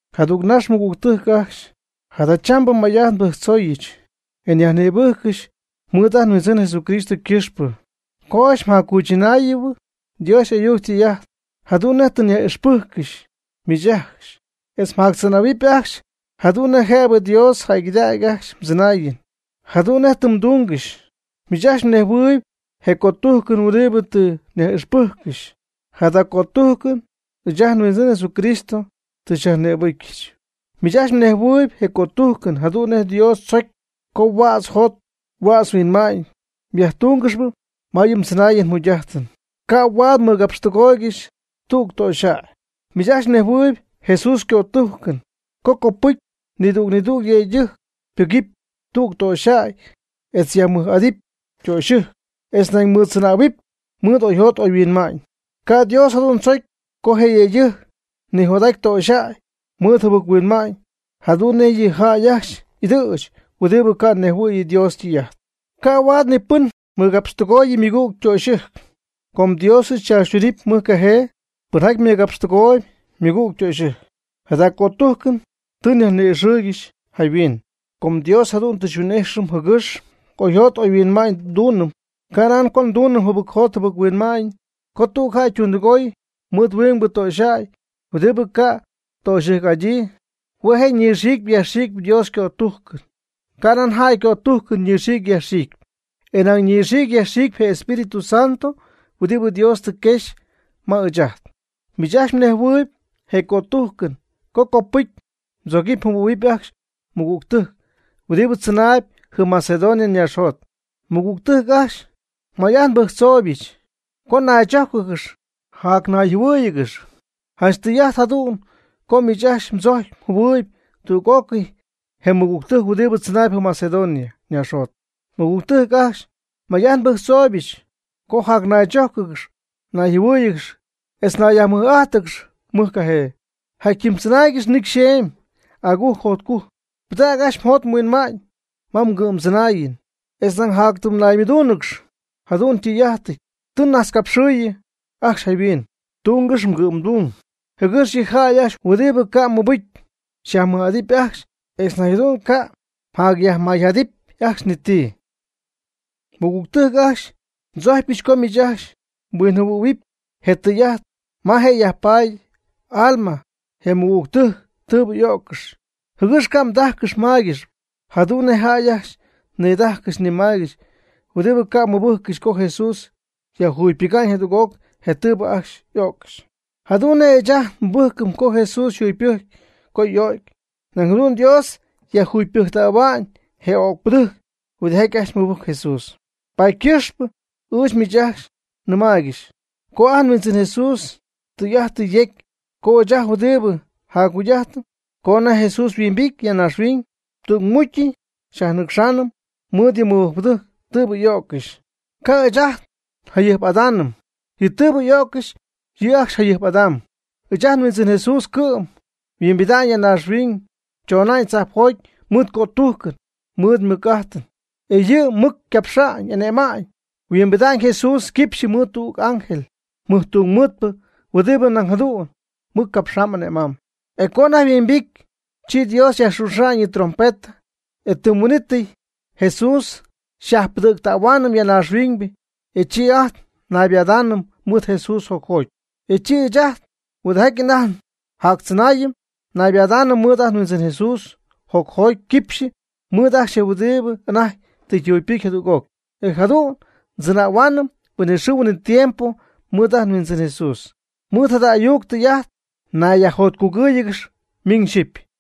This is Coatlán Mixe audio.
Jadüg nax, mɨgügtɨjc ajcxy, jadachambɨ may'ajt nbɨjctzooyɨch, e nyajnïbɨjccɨxy mɨɨd ajt nHuindzɨn Jesucristo ycɨxpɨ co ajcxy mjaccuychɨnähuɨpy Dios y'ayuc ytɨy'ajt, jadu'n nej tɨ nyaj'ixpɨcyɨch miich ajcxy, etz mjactzɨnähuɨpy ajcxy jadu'n nej jëbɨ Dios jäygɨdägy ajcxy mdzɨnaayɨn, jadu'n nej tɨ mdungɨxy. Miich ajcxy mnejhuɨɨyb je cötujcɨn huɨdibɨ tɨ nyaj'ixpɨjccɨxy. Jada cötujcɨn ɨɨch ajt nHuindzɨn Jesucristo tɨ xyajnïbɨcyɨch. Miich ajcxy mnejhuɨɨyb je cötujcɨn jadu'n nej Dios tzocy co huädz jot huädz huinma'ñ myajtúngɨxɨpy ma yɨ mdzɨnaayɨn mjugy'ajtɨn. Ca' huaad mmɨgapxtɨgooygɨxy tüg töxyjäy. Miich ajcxy mnejhuɨɨyb Jesús ycötujcɨn co copɨcy nidüg nidüg yëydɨjc pɨgɨpy tüg töxyjäy etz yajmɨj'adɨp ytöxyɨjc, etz nañ mɨɨddzɨnähuɨpy mɨɨd oyjot oyhuinma'ñ. Ca' Dios jadu'n tzocy co je yëydɨjc nijot'aty töxyjäy mɨɨd jɨbɨc-huinma'ñ, jadu'n nej yɨ jäy ajcxy y'ɨdɨ̈ch huɨdibɨ ca' nejhuɨ̈y Dios ytɨy'ajt. Ca' huaad ni pɨn mɨgapxtɨgooyɨ ymɨgüg ytöxyɨjc, com Dios yɨ' tzaachytunɨɨb mɨjcajee pɨnjaty mɨgapxtɨgooyb ymɨgüg ytöxyɨjc. Jada cötujcɨn tɨ nyajni'ixɨɨygɨxy jayhuin. Com Dios jadu'n tɨ xyhuin'ijxɨm jɨgɨx oyjot oyhuinma'ñ ndunɨm, canan co ndunɨm jɨbɨc jot jɨbɨc-huinma'ñ. Co tüg jäy ytundɨgooy mɨɨd huingbɨ töxyjäy huɨdibɨ ca' töxyɨjc'adyii, hue' je' ñɨxiicpy yajxiicpy Dios ycötujcɨn, canan jäy ycötujcɨn ñɨxiicɨpy yajxiicɨpy, e nañ ñɨxiicpy yajxiicpy je Espíritu Santo huɨdibɨ Dios tɨ quexy ma ɨɨch ajt. Miich ajcxy mnejhuɨɨyb je cötujcɨn co copɨcy mdzogɨpy mjɨhuɨ̈huɨpy ajcxy mmɨgügtɨjc huɨdibɨ tzɨnaayb jɨm Macedonia ñaaxjot. Mɨgügtɨjc ajcxy, may'ajt nbɨjctzooybɨch co jacnaychójcɨgɨx jacnayjɨhuɨ́ɨyɨgɨx. Janch tɨy'ajt jadu'n co miich ajcxy mdzocy mjɨhuɨ̈y tüg'ócɨy je mɨgügtɨjc huɨdi tzɨnaayb jɨm Macedonia ñaaxjot. Nmɨgügtɨjc ajcxy, may'ajt nbɨjctzooybɨch co jacnaychójcɨgɨxy nayjɨhuɨ́ɨyɨgɨxy etz mnayyajmɨj'ájtɨgɨxy mɨj cajee. Jatyɨm tzɨnaaygɨx nicy xeemy, agujc jotcujc. Pɨdäg ajcxy mjot mhuinma'ñ ma mgɨ'mdzɨnaayɨn, etz nañ jatytɨm naymɨdúunɨgɨx. Jada tɨy'ajt tɨ najtzcapxɨɨyɨ ajcxy jayhuin. Tungɨx mgɨ'mdung, jɨgɨx yɨ jäy ajcxy huɨdibɨ ca' ymɨbɨcy xyajmɨj'adɨp ajcxy, etz nañ jadu'n ca' myajmayjadɨpy ajcxy ni ti. Mɨgügtɨjc ajcxy, ndzojcypɨch co miich ajcxy mhuinjɨhuɨ̈huɨp je tɨy'ajt ma je' yajpaady y'alma je mɨgügtɨjc tɨɨbɨ y'öccɨxy, jɨgɨx ca' mdájcɨxɨpy mmáygɨxɨpy, jadu'n nej je jäy ajcxy nidajcɨxy nimaygɨxy huɨdibɨ ca' mɨbɨjccɨxy co Jesús yajjugypɨga'ñ jadüg'oc je tɨɨbɨ ajcxy y'o'ccɨxy. Jadu'n nej ɨɨch ajt nmɨbɨjcɨm co Jesús yjugypɨjcy co y'o'cy, nañ jadu'n Dios yajjugypɨjctähua'ñ je öcpɨdɨjc huɨdijaty ajcxy mɨbɨjc Jesús. Paady ycɨxpɨ ɨɨch miich ajcxy nnɨmaaygɨxy co ajt nHuindzɨn Jesús tɨy'ajt tɨ yecy co ɨɨch ajt huɨdibɨ jacjugy'ajtp co anajty Jesús yhuimbity ya naaxhuiñ, tügmucy xyajnɨcxaanɨm mɨɨd yɨ mɨbɨjcpɨdɨjc tɨɨbɨ y'o'ccɨxy. Ca' ɨɨch ajt njayɨjp'adaanɨm yɨ tɨɨbɨ y'o'ccɨxy, yɨ' ajcxy jayɨjp'adamb. Ɨɨch ajt nHuindzɨn Jesús cɨ'm yhuimbida'ñ ya naaxhuiñ chona'ñ tzajpjoty mɨɨd ycötujcɨn, mɨɨd ymɨc'ajtɨn, e yɨ' mɨc capxamb ane'mamb. Huimbidamb Jesús quipxyɨ mɨɨd tüg ángel mɨjtungmɨɨdpɨ huɨdibɨ nañ jadu'n mɨc capxamb ane'mamb. E co anajty yhuimbity, chi Dios yajxuxa'ñ yɨ' ytrompeta, e tɨm huin'ítɨy Jesús xyajpɨdɨ̈ctähuaanɨm ya naaxhuiñ, e chi ajt naybadaanɨm mɨɨd Jesús jocjoty. E chi ɨɨch ajt huɨdijaty anajty jactzɨnaayɨm, naybadaanɨm mɨɨd ajt nHuindzɨn Jesús jocjoty quipxyɨ mɨɨd je'ajcxy huɨdibɨ anajty tɨ yjugypɨcy jadüg'oc. E jadu'n ndzɨnähuaanɨm huinɨxɨɨ huinɨtiempo mɨɨd ajt nHuindzɨn Jesús. Mɨɨd jada ayuc tɨy'ajt nayyajjotcugɨ́ɨyɨgɨx miñ xyɨpy.